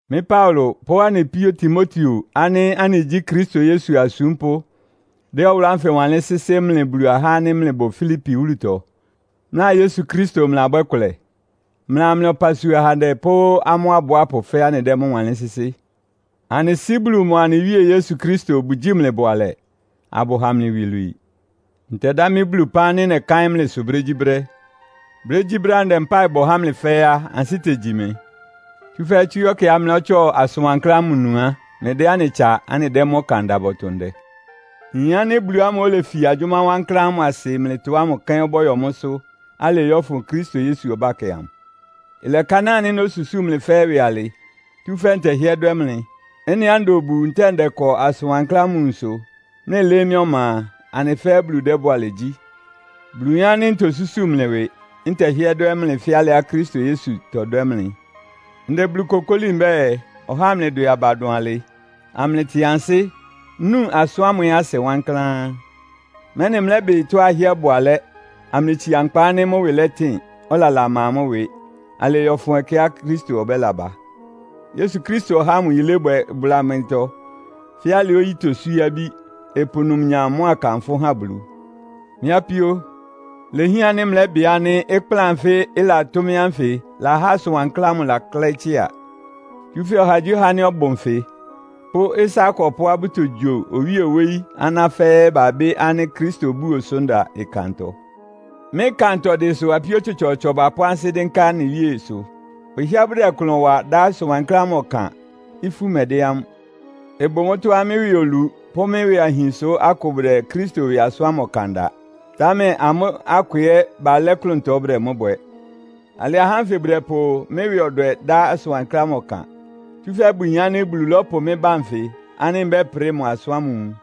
Mɩ́ Paulo pʋ́ anɩ píó Timoteo ánɩ́ anɩgyí Kristo Yesu asúmpʋ́ dɛ́ ɔwʋlʋ́ ánfɩ wanlɩ́n sɩ́sɩ́ mlɩ Bulu ahá ánɩ́ mlɩbʋ Filipi wúlutɔ, mlɩa Yesu Kristo mlɩlabwɛ́ kʋlɛ. Mlɩa mlɩ ɔpasua ahandɛ pʋ́ amʋ́ abʋápʋ fɛ́ɛ́ anɩdɛ́ mʋ́ wanlɩ́n sɩ́sɩ́. Anɩ Sɩ́ Bulu mʋa anɩ Wíe Yesu Kristo bʋgyíi mlɩ bʋalɛ, abʋha mlɩ iwilwii. Ntɛdá mɩ́ Bulu ɩpán nɩ́ nɛkáɩ́n mlɩsʋ brégyíbrɛ́. Brégyíbrɛ́á ndɛ mpáɩ bɔ há mlɩ fɛ́ɛ́ á, ansɩ́ tegyi mɩ. Tsúfɛ́ tsú ɛkɛá mlɩlɔ́tsɔ asʋn wankláán ámʋ nu á, mlɩdɛ́ anɩ tsa anɩdɛ́ mʋ́ ɔkan da bɔtʋ ndɛ. Nyin ánɩ́ Bulu ámʋ́ʋ́ olefi agyʋ́má wankláán ámʋ asɩ mlɩtɔ ámʋ kɛ́n ɔbɔ́yɔ mʋ́sʋ́ alɩɩ yɔ́fʋn Kristo Yesu ɔbákɛ amʋ. Ɩlɛkanáa ánɩ́ nósusúu mlɩ fɛ́ɛ́ ɩwɩ alɩ, tsúfɛ́ ntɛhɩ́ɛ́ dwɛ́ mlɩ. Ɩ́nɩá nda obu, ntɛ́ɛ ndɛkɔ asʋn wankláán ámʋ nwunsʋ, mlɩlɩ́ɩ́ mɩ́ ɔma a, anɩ fɛ́ɛ́ Bulu dɛ́ bʋalɛ gyí. Bulu yin ánɩ́ ntosúsu mlɩ ɩwɩ, ntɛhɩ́ɛ́ dwɛ́ mlɩ fɛ́ alɩá Kristo Yesu tɔdwɛ́ mlɩ. Ndɛ Bulu kokóli mbɛ́ɛ, ɔhá amlɩdwɛ aba dʋn alɩ, amlɩtɩn ansɩ́, nú asʋ́n ámʋ ɛ́ asɩ wankláán, mɛ́nɩ mlɛ́bɩ tɔ́á ɩhɩ́ɛ́ ɩbʋ alɛ́, amlɩtsia nkpa ánɩ́ mʋ́ ɩwɩ lɛtɩn, ɔlala ɩma mʋ́ ɩwɩ, alɩɩ yɔ́fʋn ɛkɛá Kristo ɔbɛ́laba. Yesu Kristo ɔháa mʋ yilébwɛ ɩbʋla mlɩtɔ fɛ́ alɩá oyí toswíé abí, ɩpʋ numnyam mʋ́a kanfʋ́ ha Bulu. Mɩ́ apíó, ilehián ánɩ́ mlɛ́bɩ ánɩ́ ɩkplán anfɩ́ ɩlatʋ́ mɩ́ ánfɩ lahá asʋn wankláán ámʋ laklɛ́ɩ́ tsɩ́a. Tsúfɛ́ ɔhagyíɔha ánɩ́ ɔbʋ nfɩ, pʋ́ ɩsá akɔpʋ́á bʋtogyo owíe wóyí aná fɛ́ɛ́ babɩ́ ánɩ́ Kristo-búo sʋ nda ɩkantɔ. Mɩ́ ɩkantɔdɩ sʋ apíó tsɔtsɔɔtsɔ bapʋ́ ansɩ́ dɩ́nká anɩ Wíesʋ. Bʋhɩ́ɛ́ bʋdɛ klʋn wa dá asʋn wankláán ámʋ ɔkan, ifú mɛdɛ́ amʋ́. Ɩbʋ mʋ́tɔ́á mɩ́ ɩwɩ olu pʋ́ mɩ́ ɩwɩ ahin sʋ́ akʋ bʋdɛ Kristo ɩwɩ asʋ́n ámʋ ɔkan da. Támɛ amʋ́ akʋ ɛ́ balɛ́ klʋntɔ bʋdɛ mʋ́ bwɛ. Alɩ ahá ánfɩ bʋdɛpʋ mɩ́ ɩwɩ ɔdwɛ dá asʋn wankláán ámʋ ɔkan. Tsúfɛ́ bʋyin ánɩ́ Bulu lɔ́pʋ mɩ́ ba nfɩ ánɩ́ mbɛ́prɩ mʋ asʋ́n ámʋ nwun.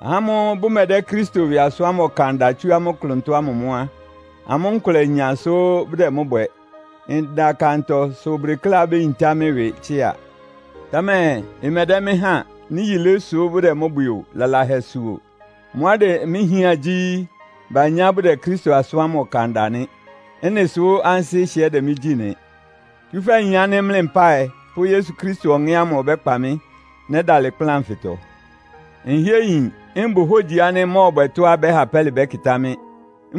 Ahá ámʋ́ʋ́ bʋmɛdɛ́ Kristo ɩwɩ asʋ́n ámʋ ɔkan da tsú amʋ́ klʋntɔ ámʋ mʋ́ á, amʋ́ nkʋlɛ inya sʋ bʋdɛ mʋ́ bwɛ. Nda ɩkantɔ sʋ bʋdekléá béyintá mɩ́ ɩwɩ tsɩ́a. Támɛ ɩmɛdɛ́ mɩ́ han, nɩ́ yilé sʋ́ bʋdɛ mʋ́ bwɛ o, lalahɛ sʋ o. Mʋ́á ɩdɛ mɩ́ hián gyí, banyá bʋdɛ Kristo asʋ́n ámʋ ɔkan da nɩ. Ɩ́nɩ sʋ́ ansɩ́ ɩhɩ́ɛ́ dɛ mɩ́ gyí nɩ́. Tsúfɛ́ nyin ánɩ́ mlɩ mpáɩ pʋ́ Yesu Kristo Ɔŋɛ́ ámʋ ɔbɛ́kpa mɩ́, nɛ́dalɩ ɩkplán anfɩtɔ. Nhɩ́ɛ́ nyin, mbʋ hógyi ánɩ́ mmɔ́ɔbwɛ tɔ́á ɩbɛ́ha pɛ́lɩ bɛ́kɩtá mɩ́.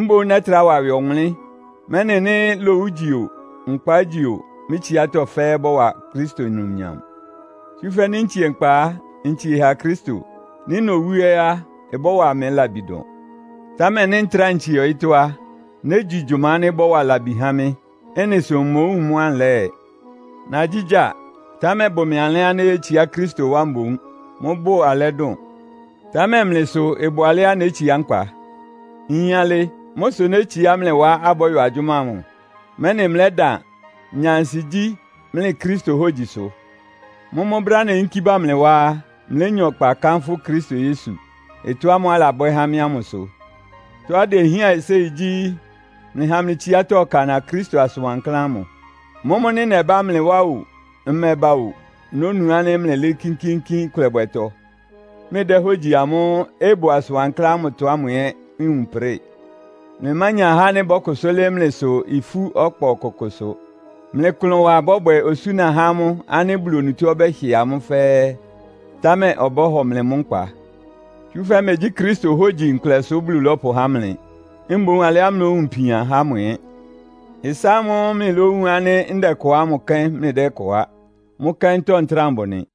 Mboún nɛ́trá wa ɩwɩ ɔwʋnlɩ́n, mɛ́nɩ nɩ́ lowu ígyi o, nkpa ígyi o, mɩ́ tsiátɔ́ fɛ́ɛ́ ɩbɔ́wa Kristo numnyam. Tsúfɛ́ nɩ́ ntsie nkpa á, ntsie ha Kristo. Nɩ́ nowú ɛ́ á, ɩbɔ́wa mɩ labi dʋn. Támɛ nɩ́ ntráa ntsie ɔyɩ́tɔ́ á, négyi gyʋma ánɩ́ ɩbɔ́wa labi há mɩ́. Ɩ́nɩ sʋ mmowúun mʋ́á nlɛ́ɛ. Nagyígyáa, támɛ ɩbʋ mɩ alɛ́á néyétsiá Kristo wá mboún. Mʋ́bʋ alɛ́ dʋn. Támɛ mlɩ sʋ ɩbʋ alɛ́á nétsiá nkpa. Nyin alɩ. Mʋ́ sʋ nétsiá mlɩ wá abɔ́yɔ agyʋ́má ámʋ, mɛ́nɩ mlɛ́dan, nya ansigyí mlɩ Kristo hógyi sʋ. Mʋ́mʋ́ brɛ́á neyínkí bá mlɩ wá á, mlénya ɔkpa kánfʋ́ Kristo Yesu, ɩtɔ́ ámʋ́ʋ́ alabwɛ́ há mɩ́ ámʋ sʋ. Tɔ́á idehián séi gyí, mlɩha mlɩ tsiátɔ́ ɩkana Kristo asʋn wankláán ámʋ. Mʋ́mʋ́ nɩ́ nɛbá mlɩ wá ó, mmɛba ó, nónu ánɩ́ mlɩlɩ́ɩ́ kínkíínkín ɩkʋlɛbwɛtɔ; mlɩdɛ́ hógyi amʋ́ʋ́ ɩbʋ asʋn wankláán ámʋtɔ ámʋ ɛ́ nwun prɩ́ɩ. Mlɩmánya ahá ánɩ́ bɔ́kʋsʋ́ lɩ́ɩ́ mlɩsʋ ifú ɔkpa ɔkʋkʋsʋ. Mlɩ ɩklʋnwa ɩbɔ́bwɛ osúna há amʋ́ ánɩ́ Bulu onutó ɔbɛ́hɩ amʋ́ fɛ́ɛ́, támɛ ɔbɔ́hɔ mlɩ mʋ́ nkpa. Tsúfɛ́ megyí Kristo hógyi nkʋlɛ sʋ́ Bulu lɔ́pʋhá mlɩ. Mboún alɩá mlówun ipian há mʋ ɛ́. Ɩsá ámʋ́ʋ́ mlɩlówun ánɩ́ ndɛkɔ ámʋ kɛ́n mlɩdɛ́kɔ á. Mʋ́ kɛ́ntɔ́ ntráa mbʋ nɩ.